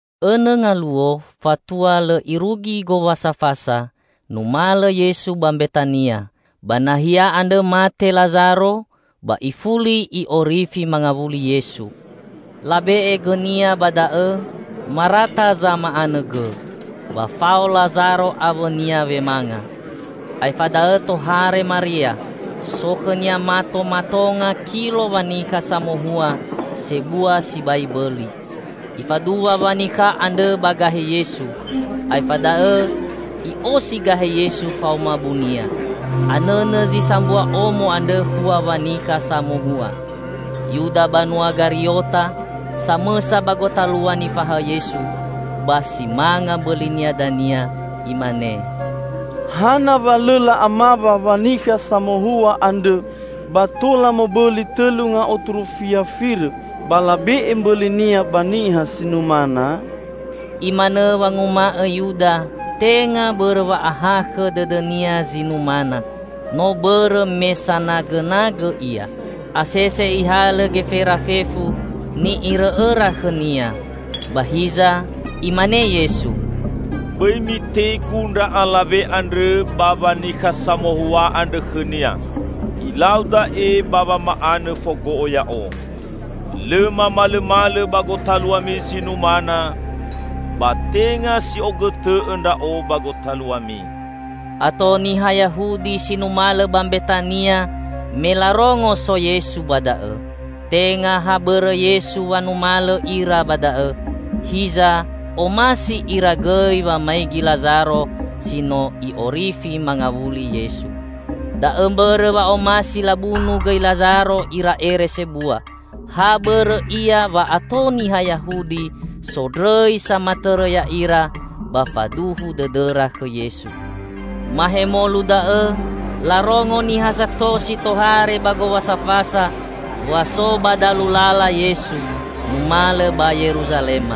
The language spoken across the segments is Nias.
Õnõ ngaluo fatua lõ irugi Gowasa Fasa, numalõ Yesu ba Mbetania. Ba nahia andrõ mate Lazaro ba ifuli I'orifi mangawuli Yesu. Labe'e gõ-Nia ba da'õ, Marata zama'anõ gõ, ba fao Lazaro awõ-Nia wemanga. Aefa da'õ tohare Maria. So khõ-Nia mato matonga kilo wanikha samohua sebua sibai bõli. Ifaduwa wanikha andrõ ba gahe Yesu. Aefa da'õ i'osi gahe Yesu faoma bunia. Anõnõ zi sambua omo andrõ hua wanikha samohua. Yuda banua Gariota, samõsa ba gotalua nifahaõ Yesu -- ba si manga mbõlinia dania -- imane, "Hana wa lõ la'amawa wanikha samohua andrõ, ba tola mobõli tõlu ngaotu rufia firõ, ba labe'e mbõlinia ba niha si numana?" Imanõ wanguma'õ Yuda tenga bõrõ wa'ahakhõ dõdõnia zi numana, no bõrõ me sanagõnagõ ia. Asese ihalõ gefera fefu ni'irõ'õra khõnia. Ba hiza Imane Yesu, "Bõi mitegu ndra alawe andrõ ba wanikha samohua andrõ khõnia! Ilau da'e ba wama'anõ fogo'o Ya'o. Lõ mamalõmalõ ba gotaluami zi numana, ba tenga si'ogõtõ'õ Ndra'o ba gotaluami." Ato niha Yahudi si numalõ ba Mbetania me larongo so Yesu ba da'õ. Tenga ha bõrõ Yesu wa numalõ ira ba da'õ, hiza omasi ira gõi wamaigi Lazaro si no I'orifi mangawuli Yesu. Da'õ mbõrõ wa omasi labunu gõi Lazaro ira ere sebua; ha bõrõ ia wa ato niha Yahudi sondrõi samatõrõ ya'ira ba faduhu dõdõra khõ Yesu. Mahemolu da'õ larongo niha sato si tohare ba Gowasa Fasa wa so ba dalu lala Yesu numalõ ba Yeruzalema.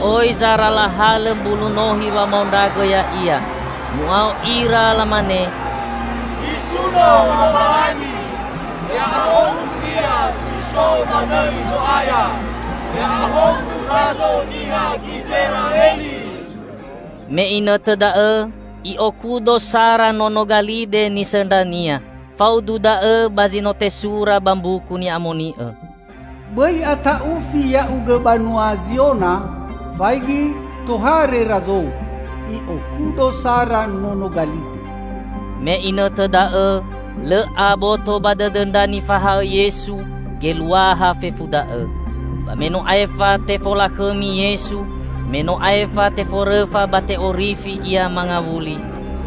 Oi zara lahalõ mbulu nohi wamaondragõ Ya'ia. Mu'ao ira lamane, "Nisuno Lowalangi! Ya'ahowu Ia si so ba dõi Zo'aya! Ya'ahowu Razo niha Gizera'eli!" Me inõtõ da'õ I'okudo sara nono galide nisõndra-Nia. Faudu da'õ ba zi no tesura ba Mbuku Ni'amoni'õ: "Bõi ata'ufi ya'ugõ banua Ziona! Faigi, tohare Razou, I'okudo sara nono galide!" Me inõtõ da'õ lõ aboto ba dõdõ ndra nifahaõ Yesu geluaha fefu da'õ. Ba me no aefa tefolakhõmi Yesu, me no aefa teforõfa ba te'orifi Ia mangawuli,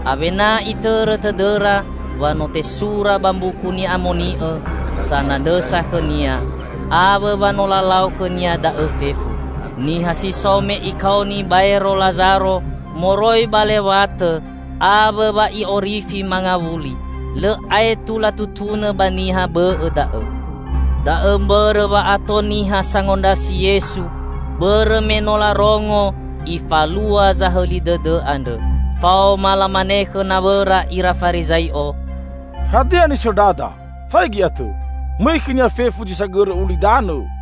awena itõrõ tõdõra wa no tesura ba Mbuku Ni'amoni'õ sanandrõsa khõ-Nia, awõ wa no lalau khõ-Nia da'õ fefu. Niha si so me Ikaoni baero Lazaro moroi ba lewatõ awõ wa I'orifi mangawuli, lõ aetu latutunõ ba niha bõ'õ da'õ. Da'õ mbõrõ wa ato niha sangondrasi Yesu bõrõ me no larongo Ifalua zahõli dõdõ andrõ. Faoma lamane khõ nawõra ira Farizai'o, "Hadia nisõndrada! Faigi atõ, mõi khõ-Nia fefu zi sagõrõ ulidanõ!"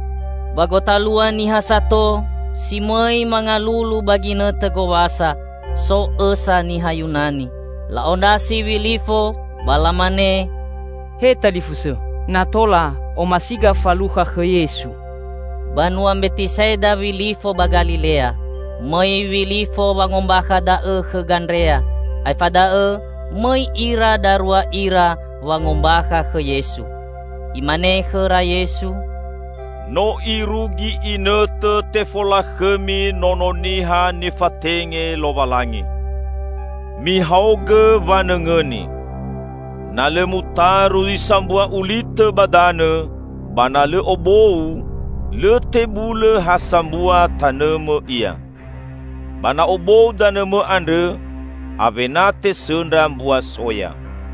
Ba gotalua niha sato si mõi mangalulu ba ginõtõ gowasa, so õsa niha Yunani. La'ondrasi Wilifo ba lamane, "He talifusõ, na tola omasiga falukha khõ Yesu." (Banua Mbetisa'ida Wilifo ba Galilea.) Mõi Wilifo wangombakha da'õ khõ Gandrea, aefa da'õ mõi ira darua ira wangombakha khõ Yesu. Imane khõra Yesu, "No irugi inõtõ tefolakhõmi Nono Niha nifatenge Lowalangi. Mihaogõ wanõngõni. Na lõ mutaru zi sambua ulitõ ba danõ, ba na lõ obou, lõ tebulõ ha sambua tanõmõ ia. Ba na obou danõmõ andrõ, awena tesõndra mbua soya.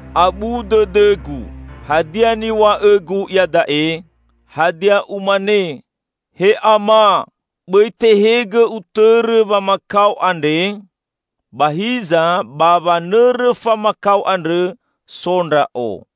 "Abu dõdõ-Gu; hadia niw̃a'õ-Gu iada'e? Hadia Umane, 'He Ama, bõi tehegõ Utõrõ wamakao andre'? Ba hiza ba wanõrõ famakao andrõ so Ndra'o.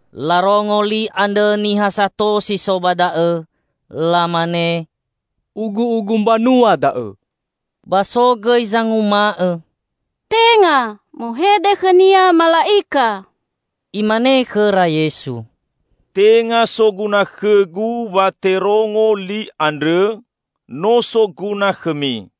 Larongo li andrõ niha sato si so ba da'õ. Lamane, "Ugu'ugu mbanua da'õ!" Ba so gõi zanguma'õ, "Tenga! Muhede khõ-Nia mala'ika!" Imane khõra Yesu, "Tenga soguna khõ-Gu wa terongo li andrõ, no soguna khõmi.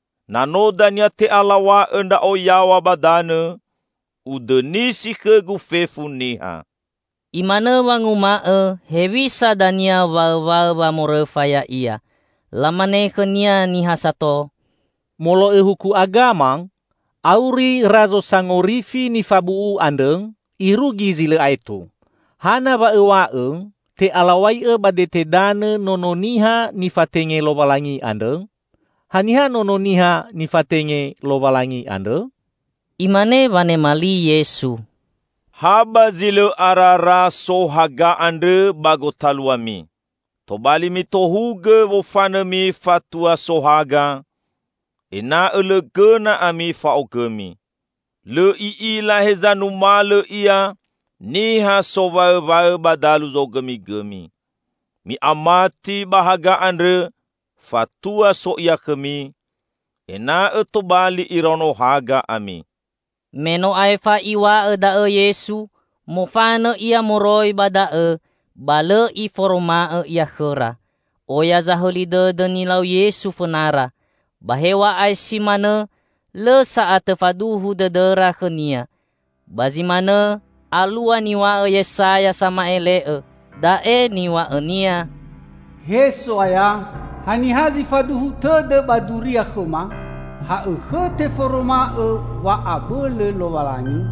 Na no dania te'alaw̃a'õ Ndra'o yaw̃a ba danõ, Udõnisi khõ-Gu fefu niha." Imanõ wanguma'õ hewisa dania waõwaõ wamorõfa Ya'ia. Lamane khõ-Nia niha sato, "Molo'õ huku agama, auri Razo Sangorifi nifabu'u andrõ irugi zi lõ aetu. Hana wa Õw̃a'õ te'alaw̃ai'õ ba dete danõ Nono Niha nifatenge Lowalangi andrõ? Haniha Nono Niha nifatenge Lowalangi andrõ?" Imane wanema li Yesu, "Ha ba zi lõ arara so haga andrõ ba gotaluami. Tobali mitohugõ wofanõmi fatua so haga, ena'õ lõ gõna ami fa'ogõmi. Lõ i'ila heza numalõ ia niha sowaõwaõ ba dalu zogõmigõmi. Mi'amati ba haga andrõ fatua so Ia khõmi, ena'õ tobali iraono haga ami." Me no aefa Iw̃a'õ da'õ Yesu, mofanõ Ia moroi ba da'õ ba lõ Iforoma'õ Ia khõra. Oya zahõli dõdõ nilau Yesu fõnara. Ba hew̃a'ae si manõ lõ sa'atõ faduhu dõdõra khõ-Nia. Ba zi manõ alua niw̃a'õ Yesaya sama'ele'õ. Da'e niw̃a'õnia, "He So'aya, haniha zi faduhu tõdõ ba duria khõma? Ha'õkhõ teforoma'õ wa'abõlõ Lowalangi?"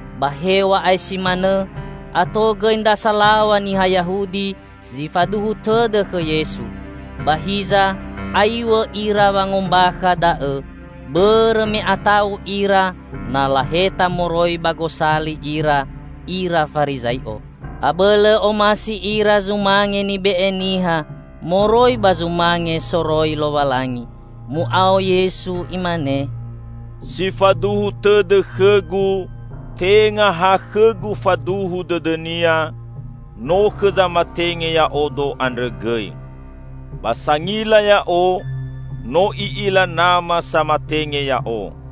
Ba hew̃a'ae si manõ, ato gõi ndra salaw̃a niha Yahudi zi faduhu tõdõ khõ Yesu. Ba hiza aiw̃õ ira wangombakha da'õ, bõrõ me ata'u ira na laheta moroi ba gosali ira, ira Farizai'o. Abõlõ omasi ira zumange nibe'e niha moroi ba zumange soroi Lowalangi. Mu'ao Yesu Imane, "Si faduhu tõdõ khõ-Gu, tenga ha khõ-Gu faduhu dõdõnia, no khõ zamatenge Ya'odo andrõ gõi. Ba sangila Ya'o, no i'ila Nama samatenge Ya'o.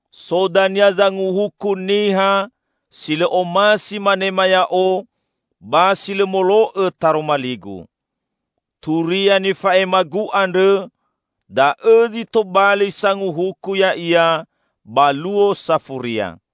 So dania zanguhuku niha si lõ omasi manema Ya'o ba si lõ molo'õ taroma li-Gu. Turia nifa'ema-Gu andrõ, da'õ zi tobali sanguhuku ya'ia ba Luo Safuria!